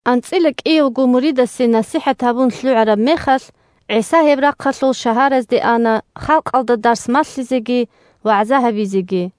АнцӀила кӀиявго муридасе насихӀат гьабун лъугӀараб мехалъ, ГӀиса гьеб рахъалъул шагьаразде ана халкъалда дарс малъизеги вагӀза гьабизеги.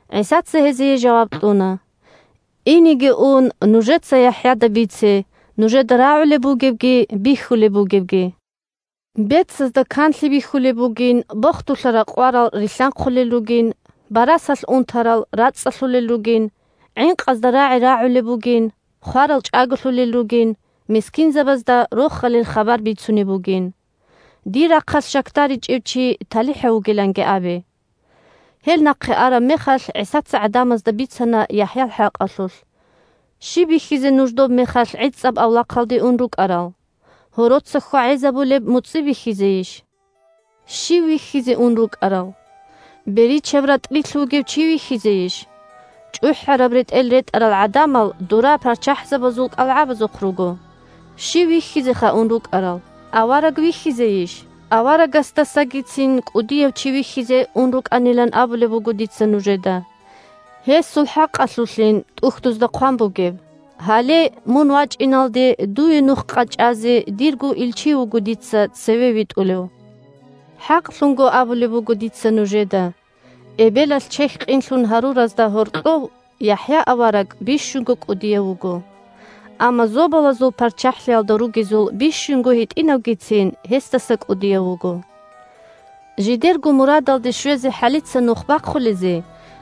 ГӀисаца гьезие жаваб кьуна: – Инеги ун, нужеца ЯхӀяда бице нужеда рагӀулеб бугебги бихьулеб бугебги: бецазда канлъи бихьулеб бугин, бохдулъа ракъварал рилълъанхъулел ругин, барасалъ унтарал рацӀцӀалъулел ругин, гӀинкъазда рагӀи рагӀулеб бугин, хварал чӀаголъулел ругин, мискинзабазда Рохалил хабар бицунеб бугин. Дир рахъалъ щакдаричӀев чи талихӀав вугиланги абе. Гьел нахъе араб мехалъ ГӀисаца гӀадамазда бицана ЯхӀял хӀакъалъулъ: – Щиб бихьизе нуж добмехалъ гӀицӀаб авлахъалде ун рукӀарал? Гьороца хьвагӀезабулеб муцӀи бихьизейищ? Щив вихьизе ун рукӀарал? Беричаб ратӀлилъ вугев чи вихьизейищ? ЧӀухӀараб ретӀел ретӀарал гӀадамал дора парччахӀзабазул кӀалгӀабазухъ руго. Щив вихьизеха ун рукӀарал? Авараг вихьизейищ? Аварагасдасагицин кӀудияв чи вихьизе ун рукӀанилан абулеб буго дица нужеда! Гьесул хӀакъалъулъин ТӀухьдузда хъван бугеб: «Гьале, мун вачӀиналде дуе нух къачӀазе дирго илчи вуго дица цеве витӀулев». ХӀакълъун абулеб буго дица нужеда: эбелалъ чехь къинлъун гьаруразда гьоркьов ЯхӀя авараг бищунго кӀудияв вуго. Амма Зобалазул ПарччахӀлъиялда ругезул бищунго гьитӀинавгицин гьесдаса кӀудияв вуго. Жидерго мурадалде щвезе хӀалица нух бахъулезе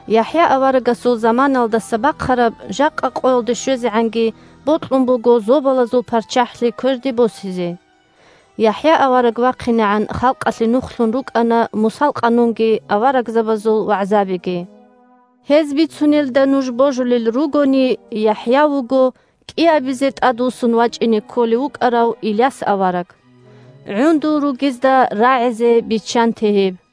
ЯхӀя аварагасул заманаялдаса бахъараб жакъа къоялде щвезегӀанги бокьун буго Зобалазул ПарччахӀлъи кверде босизе. ЯхӀя авараг вахъинегӀан халкъалъе нухлъун рукӀана Мусал Къанунги аварагзабазул вагӀзабиги. Гьез бицунелда нуж божулел ругони, ЯхӀя вуго кӀиабизе тӀадвуссун вачӀине кколев вукӀарав Иляс авараг. ГӀундул ругезда рагӀизе биччанте гьеб!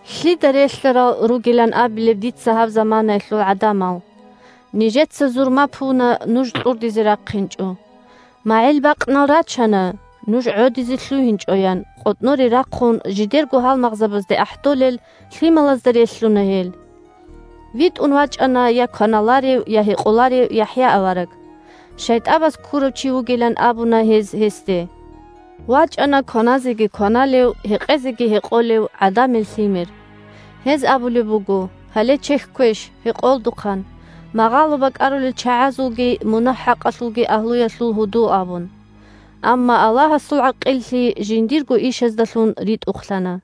Лъида релълъарал ругилан абилеб дица гьаб заманаялъул гӀадамал? Нижеца зурма пуна – Нуж кьурдизе рахъинчӀо, МагӀил бакънал рачана – Нуж гӀодизе лъугьинчӀо, – ян къотӀноре рахъун жидерго гьалмагъзабазде ахӀдолел лъималазда релълъуна гьел. ВитӀун вачӀана я кваналарев, я гьекъоларев ЯхӀя авараг. ШайтӀабаз ккурав чи вугилан абуна гьез гьесде. ВачӀана кваназеги кваналев, гьекъезеги гьекъолев ГӀадамил Лъимер. Гьез абулеб буго: «Гьале чехьквеш, гьекъолдухъан, магъало бакӀарулел чагӀазулги мунагь-хӀакъалъул агьлуялъулги гьудул», – абун. Амма Аллагьасул ГӀакъиллъи жиндирго ишаздалъун ритӀухълъана.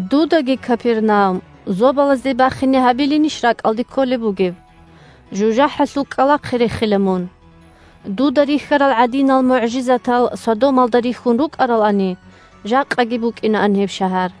Дудаги, Капернаум, зобалазде бахине гьабилинищ ракӀалде кколеб бугеб? ЖужахӀалъул кӀкӀалахъе рехила мун! Дуда рихьарал гӀадинал мугӀжизатал Содомалда рихьун рукӀаралани, жакъаги букӀинаан гьеб шагьар.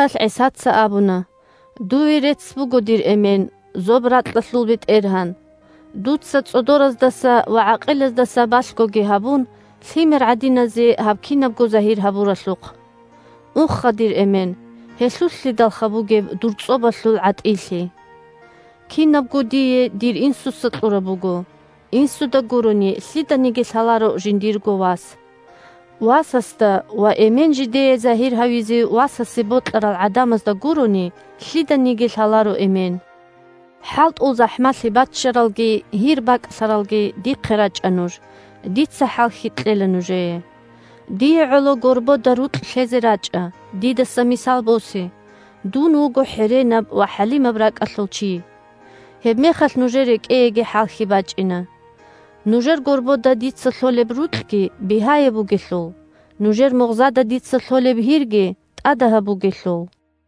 Гьебмехалъ ГӀисаца абуна: – Дуе рецц буго, дир Эмен, зоб-ракьалъул БетӀергьан, дуца, цӀодораздаса ва гӀакъилаздаса балъгоги гьабун, лъимер гӀадиназе гьаб кинабго загьир гьабуралъухъ. Уха, дир Эмен, гьелъулълъидалха бугеб дур цӀобалъул гӀатӀилъи! Кинабго дие дир Инсуца кьураб буго. Инсуда гурони, лъиданиги лъаларо жиндирго Вас. Васасда ва Эмен жидее загьир гьавизе Васасе бокьарал гӀадамазда гурони, лъиданиги лъаларо Эмен. ХӀалтӀул захӀмалъи баччаралги гьир бакӀлъаралги, дихъе рачӀа нуж, дица хӀалхьи кьела нужее. Дие гӀоло горбода рукь лъезе рачӀа, дидаса мисал босе: дун вуго хӀеренаб ва хӀалимаб ракӀалъул чи. Гьебмехалъ нужер рекӀееги хӀалхьи бачӀина. Нужер горбода дица лъолеб рукьги бигьаяб бугелъул, нужер мугъзада дица лъолеб гьирги тӀадагьаб бугелъул!